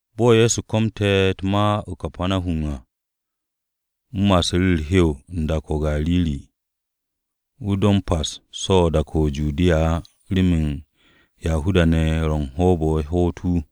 Bo̱ Ye̱so komte̱ u̱t-ma o-Kapanahum à, wu̱ ma'asu̱ru̱ u̱r-hew u̱n dak-o̱ o-Gariri. Wu̱ do m-pa so̱ u̱n dak-o̱ o-Judiya á remen Yahuda-ne̱ ye̱ ro u̱n hoob-o̱ ye̱ hoot wu̱.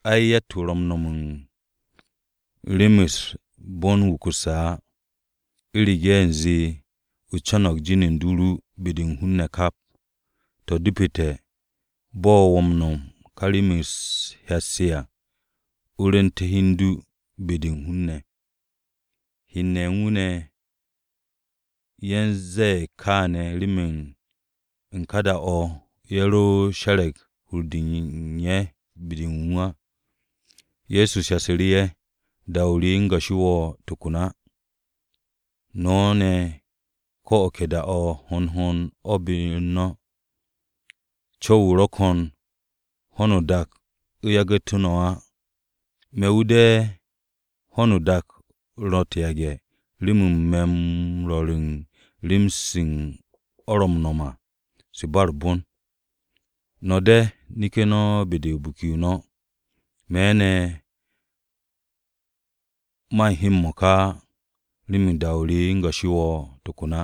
Ai, yatt-wu̱ ro̱ u̱n no̱m u̱n rem-se u̱r-bon wukusse̱ á, u̱rege̱ u̱nze o co̱no̱g jin u̱n du ru be-de u̱n hun-ne̱ kap. To̱, depete̱, bo̱ wo̱ m-no̱m u̱n ka rem-se u̱t-hyat se à, o rwu̱nte̱ hi u̱n du be-de u̱n hun-ne̱.” Hen-ne̱ ye̱ u̱n wu̱, ye̱ u̱n ze̱e̱ kááne̱ remen u̱n ka da-o̱, ye̱ ro she̱re̱g hur-de u̱n ye̱ be-de wu̱ á. Ye̱so shasu̱ru̱ ye̱, “Da-o re, o̱ u̱n goshi no̱m to̱ ko̱n á. No̱ ne̱, ko̱ o̱ ke da-o̱ hond hond o̱ be-u̱r no̱. Co̱w-o ro̱ ko̱n ho̱no o-dak u̱ yagu̱te̱ no̱ á. Me̱ wu̱ de̱ ho̱no o-dak ro̱ u̱t-yage̱ remen me̱ m-rwo̱r u̱n rem-se o̱ ro̱ m-no̱m à, se u̱n ba u̱r-bon. No̱ de̱, neke̱ no̱ be-de u̱n biki-o no̱. Me̱ ne̱, man he m-mo̱ka á, remen da-o re, o̱ u̱n goshi nom á tokon.”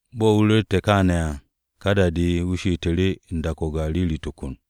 Bo̱ wu̱ ru̱ru̱te̱ ye̱ kaane̱ à, ka da-de wu̱ she'essu̱ru̱ u̱n dak-o̱ o-Gariri tokon.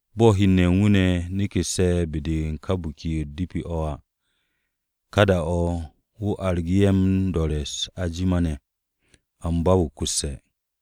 Bo̱ hen u̱n wu̱ ne̱ neke̱sse̱ be-de u̱n ka Biki-o̱ u̱t-De̱pi o̱ à, ka da-o̱ wu̱ argu̱ru̱ ye̱ m-do̱re̱ u̱s-ajima ne̱. Amba, wukusse̱.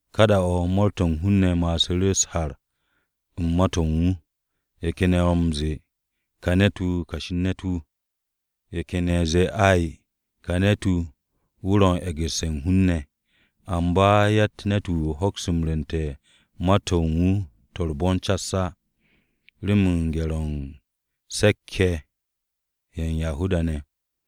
Ka da-o̱ mo̱o̱r-to̱ u̱n hun-ne̱ ma'asu̱ru̱ u̱s-har u̱n ma-to̱ u̱n wu̱. Ye̱ ken ye̱ ro̱ m-ze̱e̱, “Ka ne̱t-wu̱ kashi u̱n ne̱t-wu̱.” Ye̱ ken ye̱ zee, “Ai, ka ne̱t-wu̱, wu̱ ro̱ m-e̱gu̱sse̱ u̱n hun-ne̱.” Amba yatt ne̱t-wu̱ hokse̱ rwu̱nte̱ u̱n ma-to̱ u̱n wu̱ to̱ u̱r-bon cas á, remen gye̱r-o̱ u̱n se̱k-ye̱ ye̱ u̱n Yahuda-ne̱.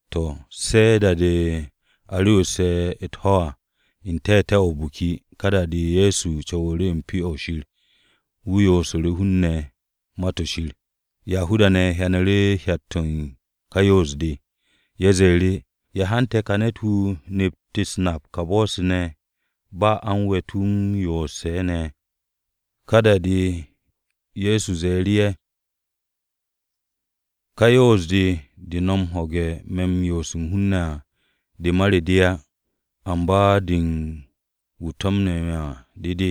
To̱, se̱ da-de a re̱wu̱sse̱ u̱t-ho̱ à, n-te̱te̱ o̱ o-biki, ka da-de Ye̱so co̱wu̱ru̱ u̱n Pyo-o̱ Shir. Wu̱ yoosu̱ru̱ hun-ne̱ Ma-to̱ Shir. Yahuda-ne̱ hyanu̱ru̱ hyat-to̱ u̱n ka yoos-de. Ye̱ ze̱e̱ru̱, “¿Ya hante̱ ka ne̱t-wu̱ nept u̱s-nap ka bo̱-se ne̱, ba a u̱n we̱t wu̱ m-yoose̱ ne̱?” Ka da-de Ye̱so ze̱e̱ru̱ ye̱, “Ka yoos-de de no̱ ho̱ge̱ me̱ m-yoose̱ u̱n hun-ne̱ à, de ma re de á. Amba de u̱n wu̱ to̱mne̱ me̱ à de de.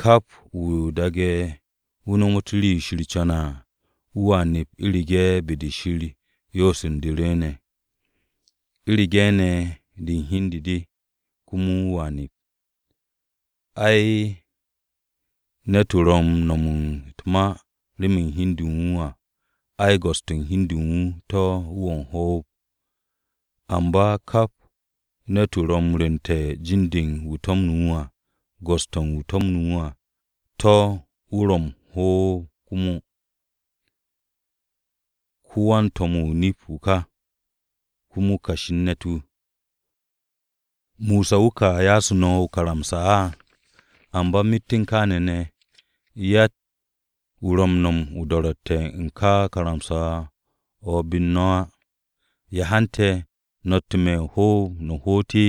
Kap wu̱ daage̱ wu̱ nomot rii-yo Shir co̱ne̱ à, wu̱a nep u̱rege̱ be-de Shir yoos u̱n de rwu̱u̱ne̱. U̱rege̱ ne̱ de u̱n hi u̱n de de, komo wu̱a nep. Ai, ne̱t-wu̱ ro̱ u̱n no̱m u̱t-ma remen hi u̱n de u̱n wu̱ à, ai, go̱s-to̱ u̱n hi u̱n de u̱n wu̱ to̱ wu̱ ro̱ o-hoob. Amba kap ne̱t-wu̱ ro̱ u̱n rwu̱nte̱ u̱n jin-de u̱n wu̱ to̱mne̱ wu̱ à, go̱s-to̱ u̱n wu̱ to̱mne̱ wu̱ à, to̱ wu̱ ro̱ o-hoob komo. Ko-wan-to̱m-wu̱ o-nip wu̱ ka, komo kashi u̱n ne̱t-wu̱. ¿Mosa wu̱ ka ya'asu̱ no̱ o-karamsa á? Amba myet u̱n kááne̱ ne̱ yatt-wu̱ ro̱ u̱n no̱m u̱n do̱ro̱tte̱-o̱ u̱n ka karamsa-o̱ be-u̱r no̱ á. ¿Ya hante̱ no̱tte̱ me̱ o-hoob no̱ hoot?”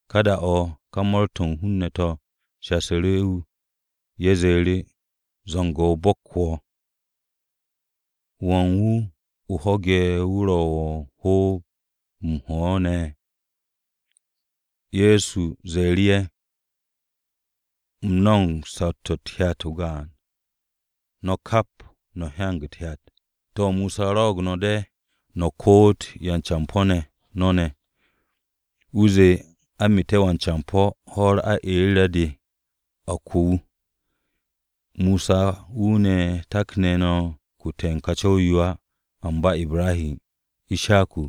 Ka da-o̱ ka mo̱o̱r-to̱ u̱n hun-ne̱ to̱ shasu̱ru̱ wu̱. Ye̱ ze̱e̱ru̱, “Zu̱ngo̱-o bo̱k wo̱! ¿Wan wu̱ o ho̱ge̱ wu̱ ro̱ wo̱ u̱n hoob-o m-ho̱ ne̱?” Ye̱so ze̱e̱ru̱ ye̱, “U̱m no̱mo̱g saw-to̱ u̱t-hyat o-gaan, no̱ kap, no̱ hyanag u̱t-hyat. To̱, Mosa rwo̱'o̱g no̱ de̱ no̱ koot yan-campo̱ no̱ ne̱. Wu̱ zee, ‘A meete̱ wan-campo̱, ho̱-u̱r aeere̱-de a ko wu̱.’ (Mosa wu̱ ne̱, takne̱ no̱ kute̱ u̱n ka co̱w-yo á, amba Ibrahi, Ishaku,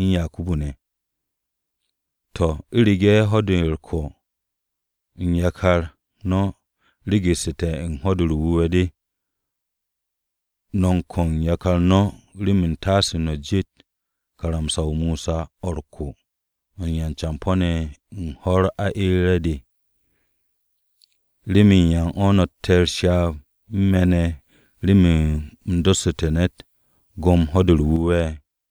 u̱n Yakubu ne̱.) To̱, u̱rege̱ ho̱-de m-ko̱ u̱n yakar no̱ regete̱ u̱n Ho̱-de u̱r-Wu̱we̱ de, no̱ m-ko̱ u̱n yakar no̱ remen u̱ntaase no̱ jet karamsa-o Mosa o̱ u̱r-ko̱ de u̱n yan-campo̱-ne̱ ho̱-u̱r aeere̱-de. ¿Remen yan no̱tte̱ u̱s-ryaab u̱n me̱ ne̱ remen u̱m dossu̱te̱ ne̱t go̱m Ho̱-de u̱r-Wu̱we̱?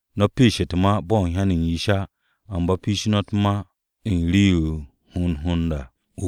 No̱ piish u̱t-ma bo̱ u̱n hyan-o̱ u̱n yish á, amba piish no̱ u̱t-ma u̱n rii-yo ro̱ hond hond à.”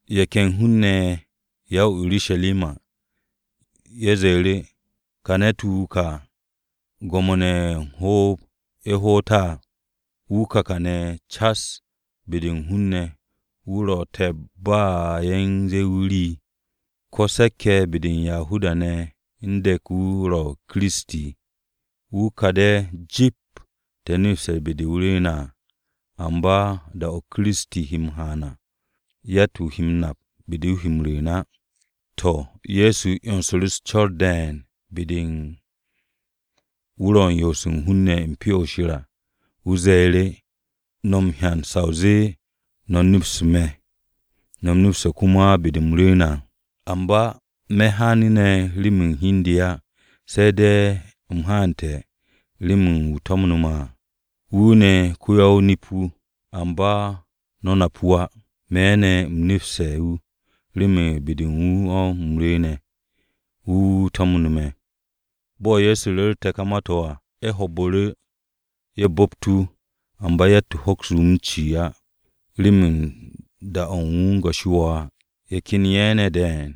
Ye̱ ken hun-ne̱ ye̱ ya-o-Urusharima, ye̱ ze̱e̱ru̱, “¿Ka ne̱t-wu̱ wu̱ ka, gwo̱mo-ne̱ ro̱ o-hoob ye̱ hoot á? Wu̱ ka ne̱ kàne̱ cas be-de u̱n hun-ne̱, wu̱ ro̱ u̱n te̱p ba ye̱ u̱n ze̱e̱ wu̱ rii! ¿Ko̱ se̱k-ye̱ be-de u̱n Yahuda-ne̱ u̱n de̱k wu̱ ro̱ Kiristi? Wu̱ ka de̱ jip te̱ nepste̱ be-de wu̱ rwu̱u̱ne̱ à, amba da-o̱ Kiristi he m-haan à, yatt-wu̱ he m-nap be-de wu̱ he m-rwu̱u̱n á.” To̱, Ye̱so 'yonsu̱ru̱ u̱s-co̱r de̱e̱n be-de wu̱ ro u̱n yoose̱ u̱n hun-ne̱ u̱n Pyo-o̱ Shir à, wu̱ ze̱e̱ru̱, “No̱ m-hyan sa o zee no̱ nepste̱ me̱, no̱ neps komo be-de u̱m rwu̱u̱ne̱ à. Amba, me̱ haanu̱ ne̱ remen hi u̱n de á. Se̱ de̱ u̱m haante̱ rem wu̱ to̱mne̱ me̱ à, wu̱ ne̱ ko-ya-o-nip-wu̱. Amba, no̱ nap wu̱ á. Me̱ ne̱, u̱m nepste̱ wu̱ remen be-de u̱n wu̱ o̱ u̱m rwu̱u̱ne̱. Wu̱ wu̱ to̱mne̱ me̱.” Bo̱ Ye̱so ru̱rte̱ ka ma-to̱ à, ye̱ ho̱o̱bu̱ru̱, ye̱ bu̱pt wu̱. Amba, yatt-wu̱ hokse̱ wu̱ m-ci á, remen da-o̱ u̱n wu̱ o̱ u̱n go̱ shi á. Ye̱ ken ye̱ ne̱ de̱e̱n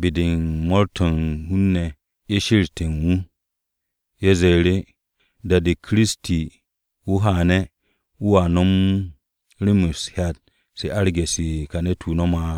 be-de u̱n mo̱o̱r-to̱ u̱n hun-ne̱ ye̱ she̱re̱ste̱ u̱n wu̱. Ye̱ ze̱e̱ru̱, “Da-de Kiristi haane̱, wu̱a nom rem-se u̱t-hyat se arge̱ se ka ne̱t-wu̱ nom á!”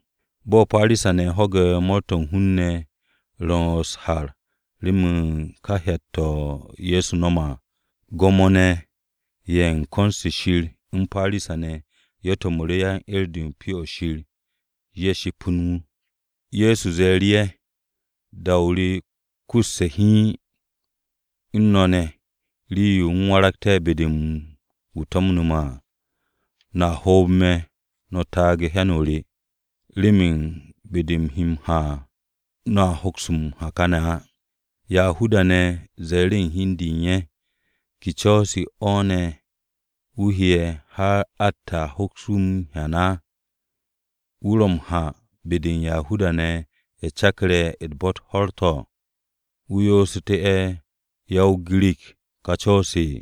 Bo̱ Parisa-ne̱ ho̱gu̱te̱ mo̱o̱r-to̱ u̱n hun-ne̱ ro̱ u̱s-har remen ka hyat-to̱ to̱ Ye̱so no̱me̱ à. Gwo̱mo-ne̱ ye̱ u̱n ko̱n-se Shir u̱n Parisa-ne̱ ye̱ to̱mu̱ru̱ yan-'er-de u̱n Pyo-o̱ Shir ye̱ ship u̱n wu̱. Ye̱so ze̱e̱ru̱ ye̱, “Ya o-da yo kusu me̱ hiin u̱n no̱ ne̱, rii-yo u̱m waragte̱ be-de u̱n wu̱ to̱mne̱ me̱ à. No̱a hoob me̱, no̱ taage̱ u̱n hyan-o re. Remen be-de u̱m he m-ha à, no̱a hoks m-ha káne̱ á.” Yahuda-ne̱ ze̱e̱ru̱ hi u̱n de u̱n ye̱, “¿Ke co̱-o̱ ne̱ wu̱ he'e̱, har atte̱ à hoks wu̱ m-hyan á? ¿Wu̱ ro̱ m-ha be-de u̱n Yahuda-ne̱ ye̱ ro̱ cakarse̱ u̱n bo̱-u̱t ho̱r-to̱, wu̱ yoosu̱te̱ ya-o-Girik ká co̱-se?”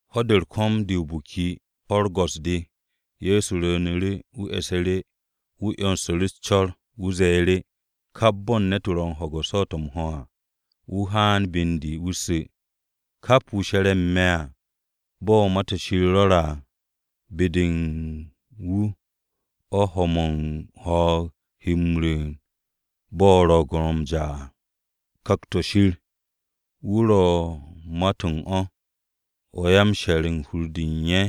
Ho̱-de u̱r-ko̱m de o-biki, ho̱-u̱r go̱s-de, Ye̱so rwu̱u̱nu̱ru̱, wu̱ e̱su̱ru̱, wu̱ 'yonsu̱ru̱ u̱s-co̱r. Wu̱ ze̱e̱ru̱, “Kap bo̱ u̱n wu̱ ro̱ u̱n ho̱ge̱ u̱n swo̱o̱t-o̱ m-ho̱ à, wu̱ haan be u̱n de wu̱ su̱. Kap wu̱ she̱re̱ u̱n me̱ à, bo̱ Ma-to̱ Shir rwo̱re̱ à, ‘Be-de u̱n wu̱ o̱ ho̱-mo̱ u̱n ho̱o̱g he m-rwu̱u̱n bo̱ ro̱o̱g-o ro̱ m-ja à.’” Ku̱kt-o̱ Shir o̱, wu̱ ro̱ u̱n ma-to̱ u̱n o̱, o̱ yan-she̱r u̱n hur-de u̱n ye̱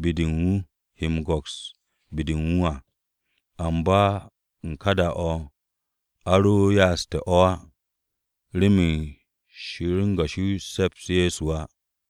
be-de u̱n wu̱ he m-go̱ks be-de u̱n wu̱ à. Amba u̱n ka da-o̱, a ro ya'aste̱ o̱ á, remen Shir o̱ u̱n goshi se̱ps Ye̱so á.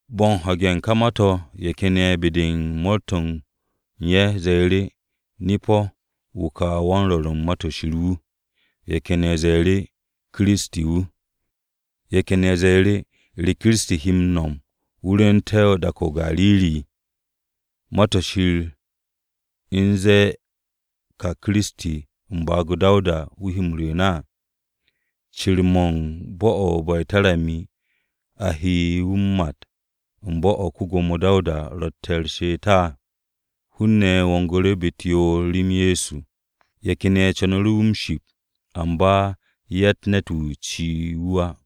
Bo̱ u̱n ho̱ge̱ u̱n ka ma-to̱ ye̱ ken ye̱ be-de u̱n mo̱o̱r-to̱ u̱n ye̱ ze̱e̱ru̱, “Nip-o̱, wu̱ ka wan-rwo̱r u̱n Ma-to̱ Shir wu̱!” Ye̱ ken ye̱ ze̱e̱ru̱, “Kiristi wu̱.” Ye̱ ken ye̱ ze̱e̱ru̱, “¿Re ne̱ Kiristi he m-no̱m wu̱ rwu̱u̱nte̱ dak-o̱ o-Gariri? ¿Ma-to̱ Shir u̱n zee ka u̱nze Kiristi, u̱n baag-o Dawuda wu̱ he m-rwu̱u̱n à? ¿Cir-mo̱ u̱n bo̱-o̱ o-Be̱tarami a he wu̱ m-mat u̱n bo̱-o̱ ko-Gwo̱mo Dawuda rotte̱ u̱r-she'et à?” Hun-ne̱ wongu̱ru̱ be-u̱t yoor rem Ye̱so. Ye̱ ken ye̱ co̱nu̱ru̱ wu̱ m-ship amba, yatt ne̱t-wu̱ ci'e̱ wu̱ á.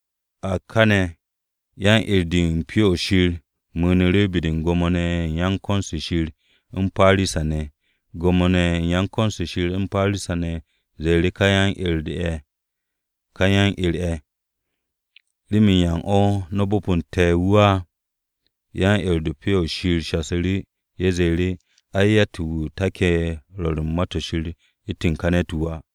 A káne̱ yan-'er-de u̱n Pyo-o̱ Shir mu̱u̱nu̱ru̱ be-de u̱n Gwo̱mo-ne̱ ye̱ u̱n ko̱n-se Shir u̱n Parisa-ne̱ ne̱. Gwo̱mo-ne̱ ye̱ u̱n ko̱n-se Shir u̱n Parisa-ne̱ ze̱e̱ru̱ ka yan-'er ye̱, “¿Remen yan o̱, no̱ bo̱po̱nte̱ wu̱ á?” Yan-'er-de u̱n Pyo-o̱ Shir shasu̱ru̱. Ye̱ zee, “Ai, yatt-wu̱ take̱ u̱n rwo̱r u̱t-ma u̱ntu̱n ka ne̱t-wu̱ á.”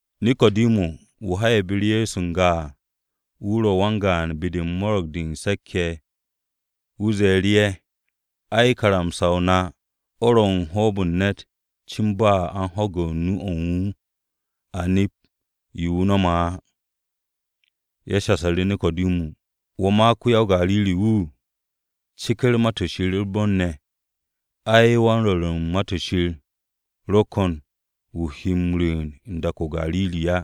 Neko̱dimu, wu̱ ha'e̱ be-u̱r Ye̱so n-ga à, wu̱ ro̱ wan-gaan be-de u̱n Mo̱ro̱g-de Se̱k-ye̱, wu̱ ze̱e̱ru̱ ye̱, “Ai, karamsa-o na o̱ ro̱ m-bo̱p u̱n ne̱t cin ba a u̱n ho̱ge̱ nu-o̱ u̱n wu̱, a nep yo wu̱ ro̱ m-no̱m á.” Ye̱ shasu̱ru̱ Neko̱dimu, “¿Wo̱ ma, ko-ya-o-Gariri-wu̱? Ceker Ma-to̱ Shir u̱r-bon ne̱. Ay, wan-rwo̱r u̱n Ma-to̱ Shir ro̱ ko̱n wu̱ he m-rwu̱u̱n u̱n dak-o̱ o-Gariri á.”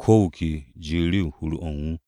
Ko̱ wu̱ ke ji'u̱ru̱ u̱n hur-o̱ u̱n wu̱.